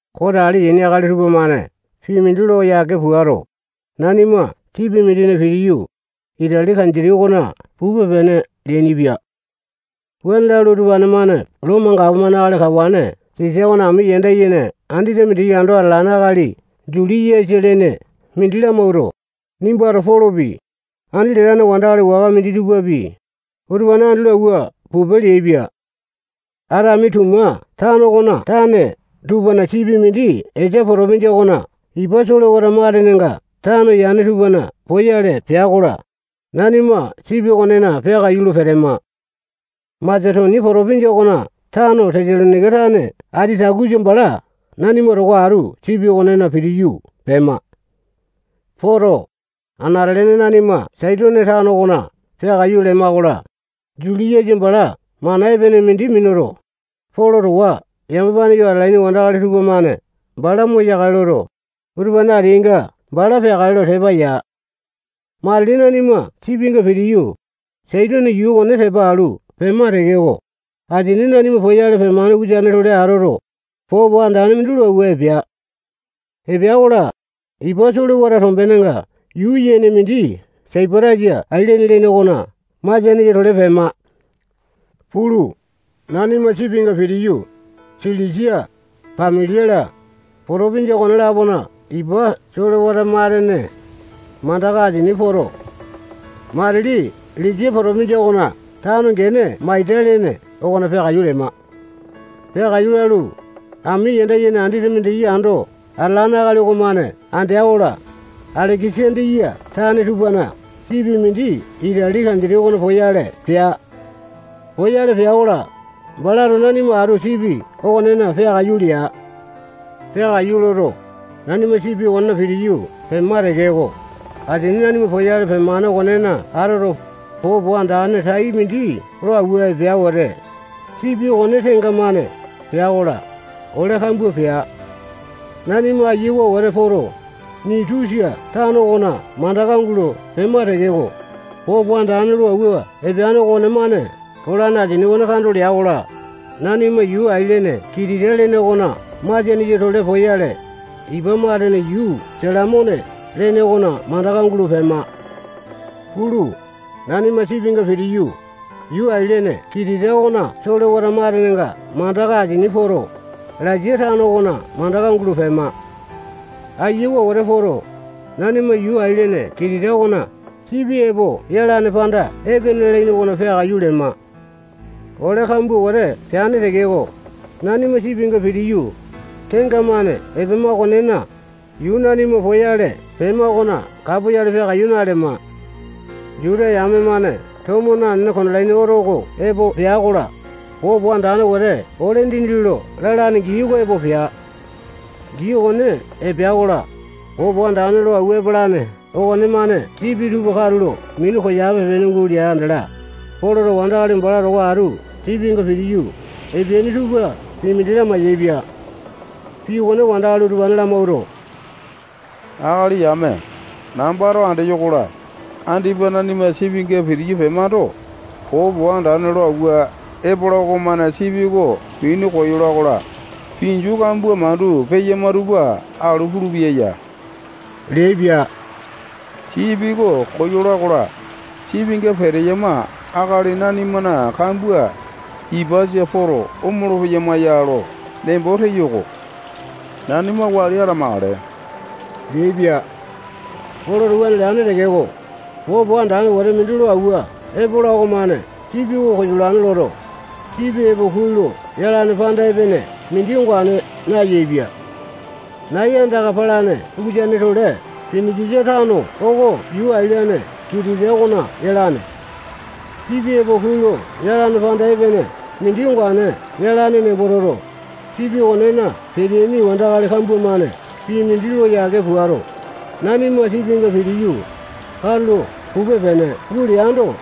Kote ale yaini akali tupamane pii mindi lo yake puato, nanima sipi mindina pitiyu, Itali kanditi okona pupe-pene leainipia. Wuane lalu, utupane-mane Lomo gapomane akali kawane Sisa okona ami yanda yene andete mindiki ando atalane akali Juliasa lene mindi lamawuato, nimbato Polopi, andi latane wandakali waka minditupapi, utupane andi lo awua pupe leaipia. Atamituma tano okona tane tupana sipi mindi Esia potopinjia okona ipa solewata matenenga tano yane tupana poyale pea-kola, nanima sipi okonena peakaiyu lo petema. Masetonia potopinjia okona tano Tesalonaika tane Atitakusa bala nanima towa atu sipi okonena pitiyu pema. Poto, anate-lene nanima Saitone tano okona peakaiyu lema-kola, Juliasa bala mana epene mindi minuto, Polo towa yamapane yo atalaini wandakali tupamane bala moyakale loto, utupane ateainga bala peakale lo tepa ya. Matili nanima sipinga pitiyu, Saitone yuu okone tepa alu pema tekeko, asini nanima poyale pemane ukusane-tole atoto, popo andane mindi lo awua epea. Epea-kola, ipa solewata tombenenga yuu yene mindi Saipatasa ailene lene okona masianesa-tole pema. Pulu, nanima sipinga pitiyu, Silisia, Pambilia-la, potopinjia okone-lapona ipa solewata matene mandaka asini poto, matili Lisia potopinjia okona tano gene Maita lene okona peakaiyu lema. Peakaiyu lalu, ami yanda yene andete mindiki ando atalane akali okomane andea-kola, Aleke-sandiya tane tupana sipi mindi Itali kanditi okona poyale pea. Poyale pea-kola, balato nanima atu sipi okonena peakaiyu lea. Peakaiyu loto, nanima sipi okonena pitiyu pema tekeko, asini nanima poyale pemane okonena atoto, popo andane tai mindi lo awua epea wete, sipi okone tenga-mane pea-kola, ole kambua pea. Nanima ayiawa wete poto, Nitusa tano okona mandaka gulo pema tekeko, popo andane lo awua epeane okonemane polane asini okone kando lea-kola, nanima yuu ailene Kitita lene okona masianesa-tole poyale, ipa matene yuu Salamone lene okona mandaka gulo pema. Pulu, nanima sipinga pitiyu, yuu ailene Kitita okona solewata matenenga mandaka asini poto, Lasea tano okona mandaka gulo pema. Ayawa wete poto, nanima yuu ailene Kitita okona Sipi Epo Yalane Panda Epene lalaini okona peakaiyu lema. Ole kambua wete peane tekeko, nanima sipinga pitiyu, tenga-mane epema okonena, yuu nanima poyale pema okona kapoyale peakaiyu nalema. Juta yame-mane tomo nanene, kondalaini oto oko epo pea-kola, popo andane wete ole dindi lo lalane gii oko epea. Gii okone epea-kola, popo andane lo awua epalane okonemane sipi tupa katulo minu koyape-pene gulea andala, Poloto wandakali bala towa atu sipinga pitiyu epeaini tupa pii mindi lamai-yaepia. Pii okone wandakali utupane lamawuato, akali yame, nambato andeyo-kola, andipa nanima sipinga pitiyu pemando, popo andane lo awua epola okomane sipi oko minu koyola-kola, pinju kambua mandu peyama tupa alu pulupeya ya leaipia. Sipi oko koyola-kola, sipinga peteyama akali nanimana kambua ipasa poto, omolo-peyama ya lo nembo teyo-ko. Nanima wali atamakale leaipia. Poloto wuane leane tekeko, popo andane wete mindi lo awua epola okomane sipi oko koyolane loto, sipi epo kuai lo yalane panda epene mindi ongane nayaepia. Nai andaka palane ukusane-tole Pinikisa tano oko yuu ailene Kitita okona yalane. Sipi epo kuai lo yalane panda epene mindi ongane yalane nembo toto, sipi okonena peteaini wandakali kambua-mane pii mindi lo yake puato, nanima sipinga pitiyu, katulo pupe-pene guleando,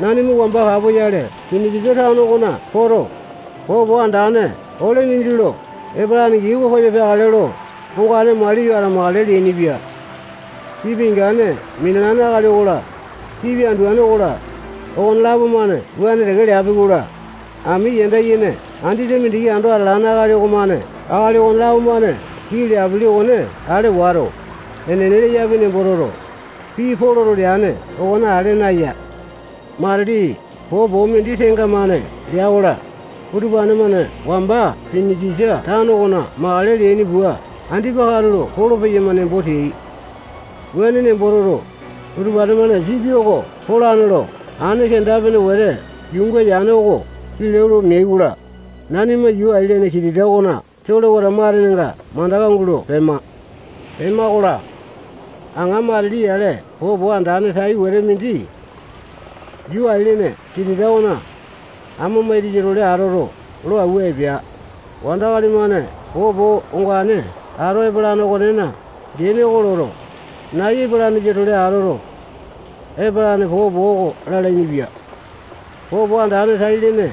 nanima wamba kapoyale Pinikisa tano okona poto, popo andane ole dindi lo epalane gii oko koyo peakale lo ongane maliyo atamakale leainipia. Sipi ingane minalane akali okola, sipi anduane okola, okonelapo-mane wuane teke leapi-kola, ami yanda yene andete mindiki ando atalane akali okomane akali okonelapo-mane pii leapili okone ale wato, enene leyapi nembo toto, pii Poloto leane okone ale naya. Matili popo mindi tenga-mane lea-kola, utupane-mane wamba Pinikisa tano okona makale leaini pua andipa katulo polo-peyama nembo teai. Wuane nembo toto, utupane-mane sipi oko polane lo aene kenda-pene wete yuunga yane oko kilau lo meai-kola, nanima yuu ailene Kitita okona solewata matenenga mandaka gulo pema. Pema-kola, aŋa matili yale popo andane tai wete mindi yuu ailene Kitita okona amo maitasa-tole atoto, lo awua epea. Wandakali-mane popo ongane ato epalane okonena gene oko loto, nai epalanesa-tole atoto, epalane popo oko lalainipia. Popo andane tai-lene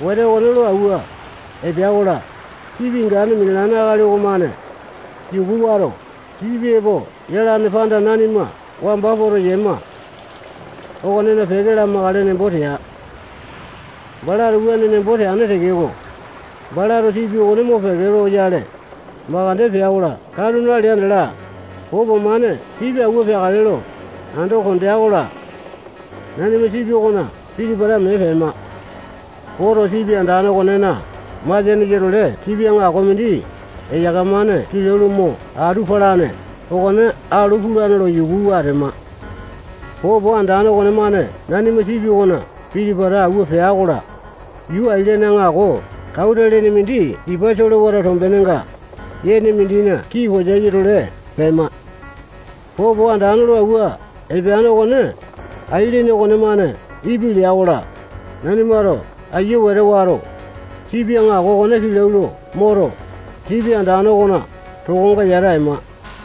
wete okone lo awua epea-kola, sipi ingane minalane akali okonemane yuku wato, sipi epo yalane panda nanima wamba poto yema okonena peke lamakale nembo tea. Balato wuane nembo teane tekeko, balato sipi okone mopeke loyale makande pea-kola, katu nalea andala, popo-mane sipi awua peakale lo ando kondea-kola, nanima sipi okona piti-pata mee pema. Poto, sipi andane okonena masianesa-tole sipi aŋako mindi eyaka-mane kilau lo mo atu palane okone alu pulane lo yukuwa atema. Popo andane okonemane nanima sipi okona piti-pata awua pea-kola, yuu ailene aŋako Kauta lene mindi ipa solewata tombenga yene mindina kii koyasa-tole pema. Popo andane lo awua epeane okone ailene okonemane ipi lea-kola, nanimato ayia wete wato, sipi aŋako okone kilau lo moto, sipi andane okona tokonga yata ema.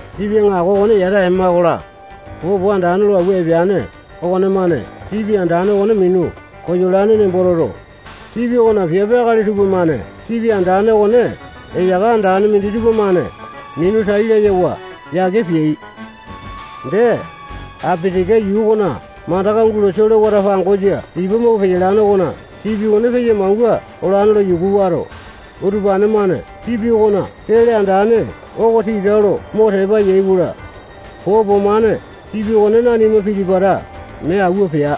Sipi aŋako okone yata ema-kola, popo andane lo awua epeane okonemane sipi andane okone minu koyolane nembo toto, sipi okona piape akali tupamane sipi andane okone eyaka andane minditupa-mane minu tai layawa yake peai. Dee, Apitika yuu okona mandaka gulo solewata pangosa ipa mau peyalane okona sipi okone peya-mangua olane lo yuku wato, utupane-mane sipi okona sele andane oko tita lo mo tepa yai-kola, popo-mane sipi oko nanima piti-pata mee awua pea.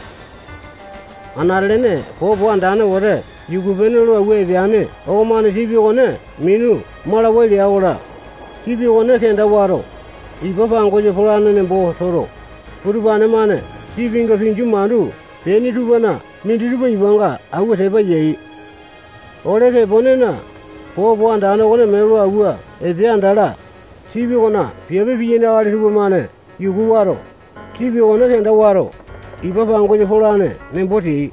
Anate-lene popo andane wete yuku-pene lo awua epeane okomane sipi okone minu malawai lea-kola, sipi okone kenda wato, ipa pangosa polane nembo toto, utupane-mane sipinga pinju mandu peaini tupana minditupa ipanga awua tepa yai. Ole teponena, popo andane okone mee lo awua epea andala, sipi okona piape piyaini akali tupamane yuku wato, sipi okone kenda wato, ipa pangosa polane nembo teai.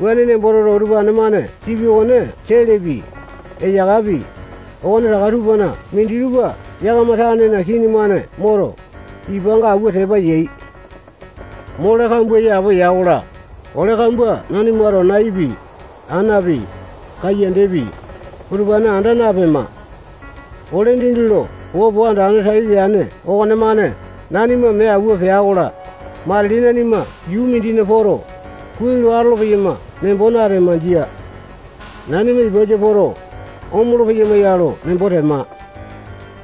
Wuane nembo toto, utupane-mane sipi okona selepi, eyakapi, okonetaka tupana minditupa yakama tanena kini-mane moto, ipanga awua tepa yai. Mole kambua yapowa ya-kola, ole kambua nanimato naipi, anapi, kayandapi, utupane anda napema. Ole dindi lo popo andane tai leane okonemane nanima mee awua pea-kola, matili nanima yuu mindina poto, kuai lo atolo-peyama nembo natema. Jia. Nanima ipasa poto, omolo-peyama ya lo nembo tema.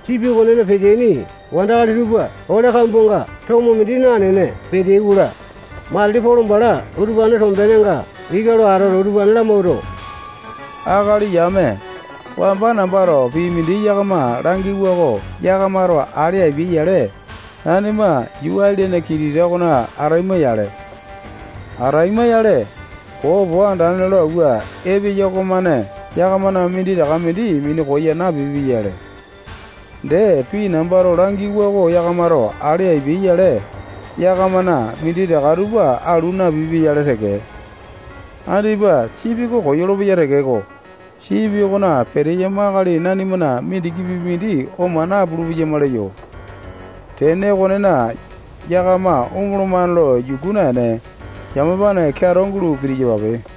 Sipi okonena peteaini wandakali tupa ole kambuanga tomo mindi nanene peteai-kola, matili Polo bala utupanena tombenenga ika lo atoto, utupane lamawuato, akali yame, wamba nambato pii mindi yakama langiwa oko yakamato ale apiai-yale, nanima yuu ailene Kitita okona ataima-yale. Ataima-yale, popo andane lo awua epeya okomane yakamana minditaka mindi minu koya napipia-yale. Dee, pii nambato langiwa oko yakamato ale apiai-yale, yakamana minditaka tupa alu napipia-yale teke. Andipa sipi oko koyolo-peya tekeko, sipi okona peteyama akali nanimana mindikipi mindi oma napulu-peyama leyo. Tene okonena, yakama omolomane lo yuku naene, yamapane keato gulo pitiyapape.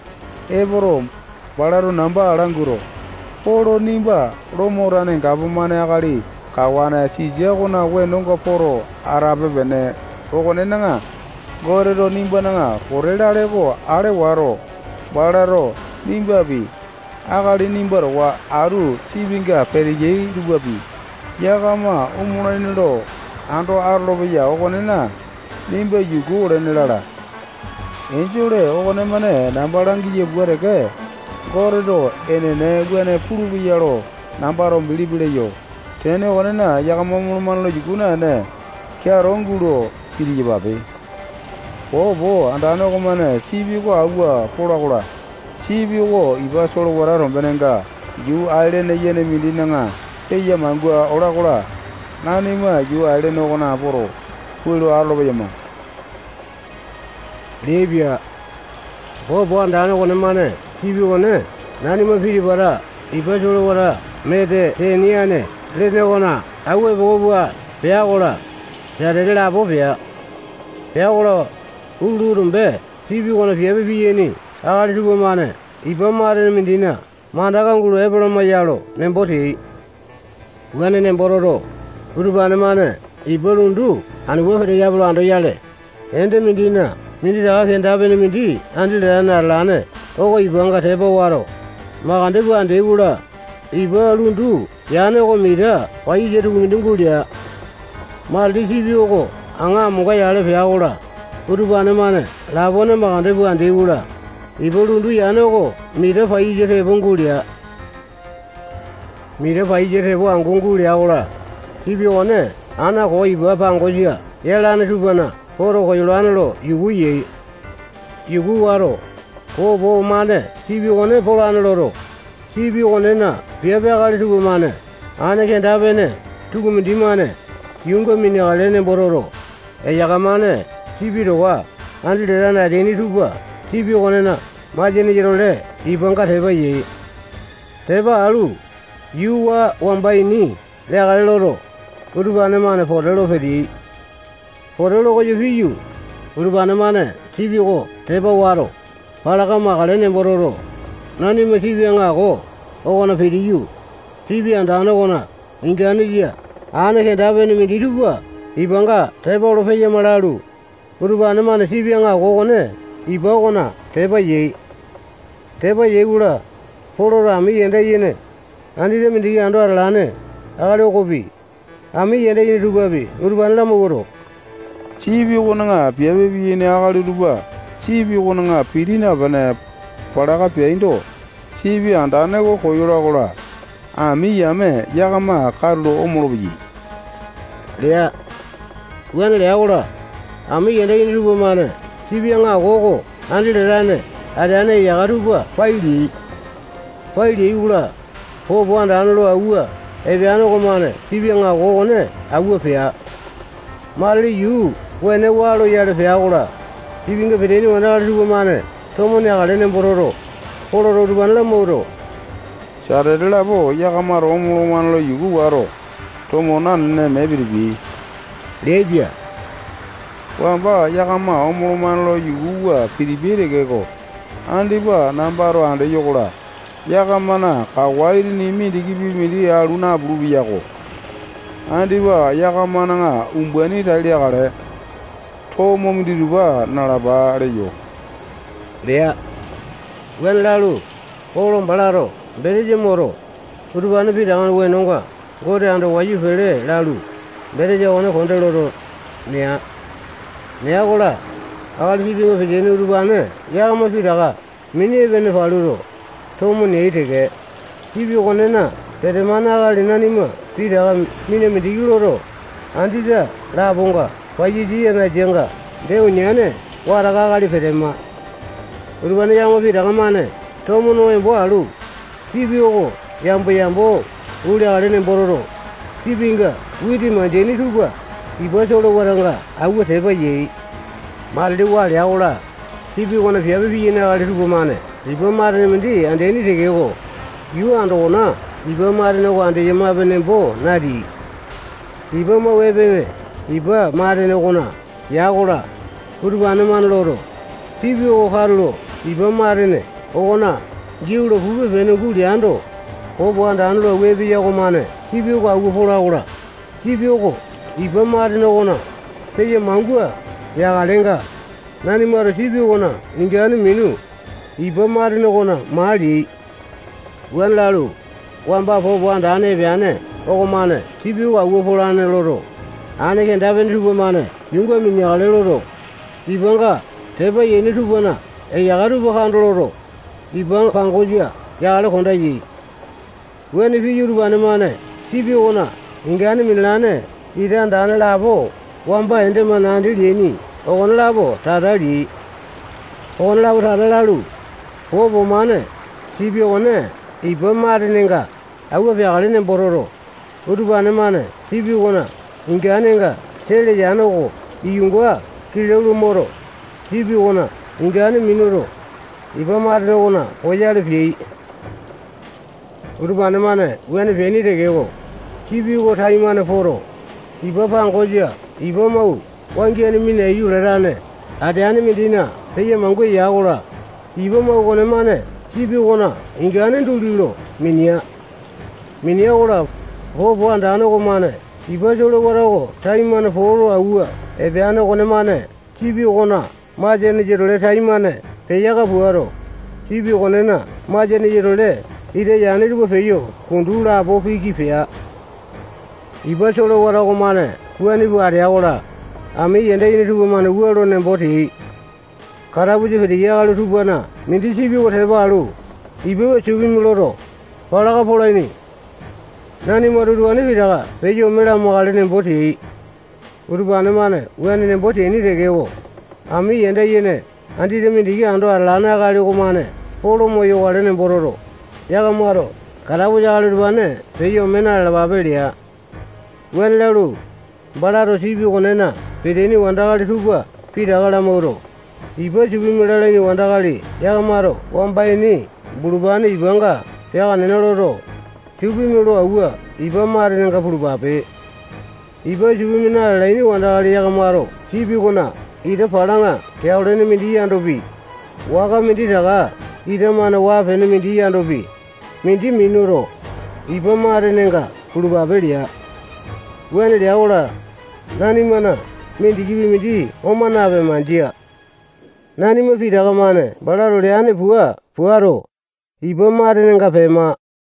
Epoto, balato namba languato, Polo, nimba Lomo tane gapomane akali kawane Sisa okona wenonga poto atape-pene okonena, Goteto nimbana pote lale oko ale wato, balato nimbapi, akali nimba towa atu sipinga peteyai tupapi, yakama omolaini lo ando atolopeya okonena, nimba yuku olene lala. Enjole okonemane namba langiya pua teke, Goteto enene wuane pulupeya lo nambato bilipi leyo. Tene okonena, yakama omolomane lo yuku naene, keato gulo pitiyapape. Popo andane okomane sipi oko awua pola-kola, sipi oko ipa solewata tombenenga yuu ailene yene mindina peya-mangua ola-kola, nanima yuu ailene okonena poto, kuai lo atolo-peyama leaipia. Popo andane okonemane sipi okone nanima piti-pata ipa solewata Metete-niane lene okona awua epoko pua pea-kola, satete lapo pea. Pea-kola, utulu tombe, sipi okonena piape piyaini akali tupamane ipa matene mindina mandaka gulo epalama ya lo nembo teai. Wuane nembo toto, utupane-mane ipa lundu anu pua peteyape lo andoyale, ende mindina minditaka kenda-pene mindi andi latane atalane oko ipanga tepa wato, makande pua andeai-kola, ipa lundu yane oko mita paiyasa tukumindi gulea. Matili sipi oko aŋa amonga yale pea-kola, utupane-mane lapone makande pua andeai-kola, ipa lundu yane oko mita paiyasa tepo gulea. Mita paiyasa tepo angu gulea-kola, sipi okone ana koo ipa pangosa yalane tupana poto, koyolane lo yuku yai. Yuku wato, popo-mane sipi okone polane loto, sipi okonena piape akali tupamane aene kenda-pene tukumindi-mane yuunga mineakale nembo toto, eyaka-mane sipi towa andi latane ateaini tupa sipi okonena masianesa-tole ipanga tepa yai. Tepa alu, yuu waa wamba ini leakale loto, utupane-mane pote lo peteai. Pote lo koyo piyu, utupane-mane sipi oko tepa wato, palaka makale nembo toto, nanima sipi aŋako okona pitiyu, sipi andane okona inganesa aene kenda-pene minditupa ipanga tepa olo peyama lalu, utupane-mane sipi aŋako okone ipa okona tepa yai. Tepa yai-kola, Poloto ami yanda yene andete mindiki ando atalane akali okopi, ami yanda yene tupapi, utupane lamawuato, sipi okona piape piyaini akali utupa sipi okona piti napene, palaka peaindo, sipi andane oko koyola-kola, ami yame yakama katulo omolo-peyai lea. Wuane lea-kola, ami yanda yene tupamane sipi aŋako oko andi latane ateane eyaka tupa pai leai. Pai leai-kola, popo andane lo awua epeane okomane sipi aŋako okone awua pea. Matili yuu wene waa loyale pea-kola, sipinga peteaini wandakali tupamane tomo neakale nembo toto, Poloto utupane lamawuato, satete lapo yakamato omolomane lo yuku wato, tomo nanene mee pitipiai leaipia. Wamba yakama omolomane lo yukuwa pitipiyai tekeko, andipa nambato andeyo-kola, yakamana kawa itini mindikipi mindi alu napulu-peyako. Andipa yakamana umbaini tai leakale. Tomo minditupa nalapa leyo lea. Wuane lalu, Polo balato betesa moto, utupane pitakana wenonga Gote ando wayu pele lalu, betesa okone konde loto, nea. Nea-kola, akali sipinga peteaini utupane yakama pitaka mini epene paluto, tomo neai teke. Sipi okonena petemane akali nanima pitaka mina mindiki loto, andete laponga paiyasa yanasanga dee uniane wataka akali petema. Utupane yakama pitaka-mane tomo no embo alu, sipi oko yambo-yambo guleakale nembo toto, sipinga witi mandeaini tupa ipa solewatanga awua tepa yai. Matili waa lea-kola, sipi okona piape piyaini akali tupamane ipa matene mindi andeaini tekeko, yuu andokona ipa matene oko andeyama nembo nateai. Ipa mau epene ipa matene okona ya-kola, utupane-mane loto, sipi oko katulo ipa matene okona giau lo pupe-pene guleando, popo andane lo awua epeya okomane sipi oko awua pola-kola, sipi oko ipa matene okona peya mangua yakalenga, nanimato sipi okona ingane minu, ipa matene okona maa leai. Wuane lalu, wamba popo andane epeane okomane sipi oko awua polane loto, aene kenda-pene tupamane yuunga mineakale loto, ipanga tepa yaini tupana eyaka tupa kando loto, ipa pangosa yakale konda yai. Wuane piyu, utupane-mane sipi okona ingane minalane ita andane lapo wamba ende-mane andi leaini okonelapo tata leai. Okonelapo tata lalu, popo-mane sipi okone ipa matenenga awua peakale nembo toto, utupane-mane sipi okona inganenga sele yane oko iyunga kilau lo moto, sipi okona ingane minuto, ipa matene okona poyale peai. Utupane-mane wuane peaini tekeko, sipi oko taimane poto, ipa pangosa ipa mau wangiane minaiyu latane ateane mindina peya mangua ya-kola, ipa mau okonemane sipi okona ingane duli lo minea. Minea-kola, popo andane okomane ipa solewata oko taimane poo lo awua epeane okonemane sipi okona masianesa-tole taimane peyaka puato, sipi okonena masianesa-tole ita yane tupa peyo kundu lapo piki pea. Ipa solewata okomane wuane pua atea-kola, ami yanda yene tupamane wua lo nembo teai: Katapusa peteyai akali tupana mindi sipi oko tepa alu, ipa supimi loto, palaka polaini. Nanimato utupane pitaka peyo ome lamakale nembo teai. Utupane-mane wuane nembo teaini tekeko, ami yanda yene andete mindiki ando atalane akali okomane Polo moyokale nembo toto, yakamato katapusa akali utupane peyo ome na-lalapape lea. Wuane lalu, balato sipi okonena peteaini wandakali tupa pitaka lamawuato, ipa supimi lalaini wandakali yakamato wamba ini bulupane ipanga peaka nena loto, supimi lo awua ipa matenenga pulupape. Ipa supimi na-lalaini wandakali yakamato sipi okona ita palaŋa keao lene mindi yandopi, waka minditaka ita-mane waa-pene mindi yandopi, mindi minuto, ipa matenenga pulupape lea. Wuane lea-kola, nanimana mindikipi mindi oma napema. Jia. Nanima pitaka-mane balato leane pua puato, ipa matenenga pema.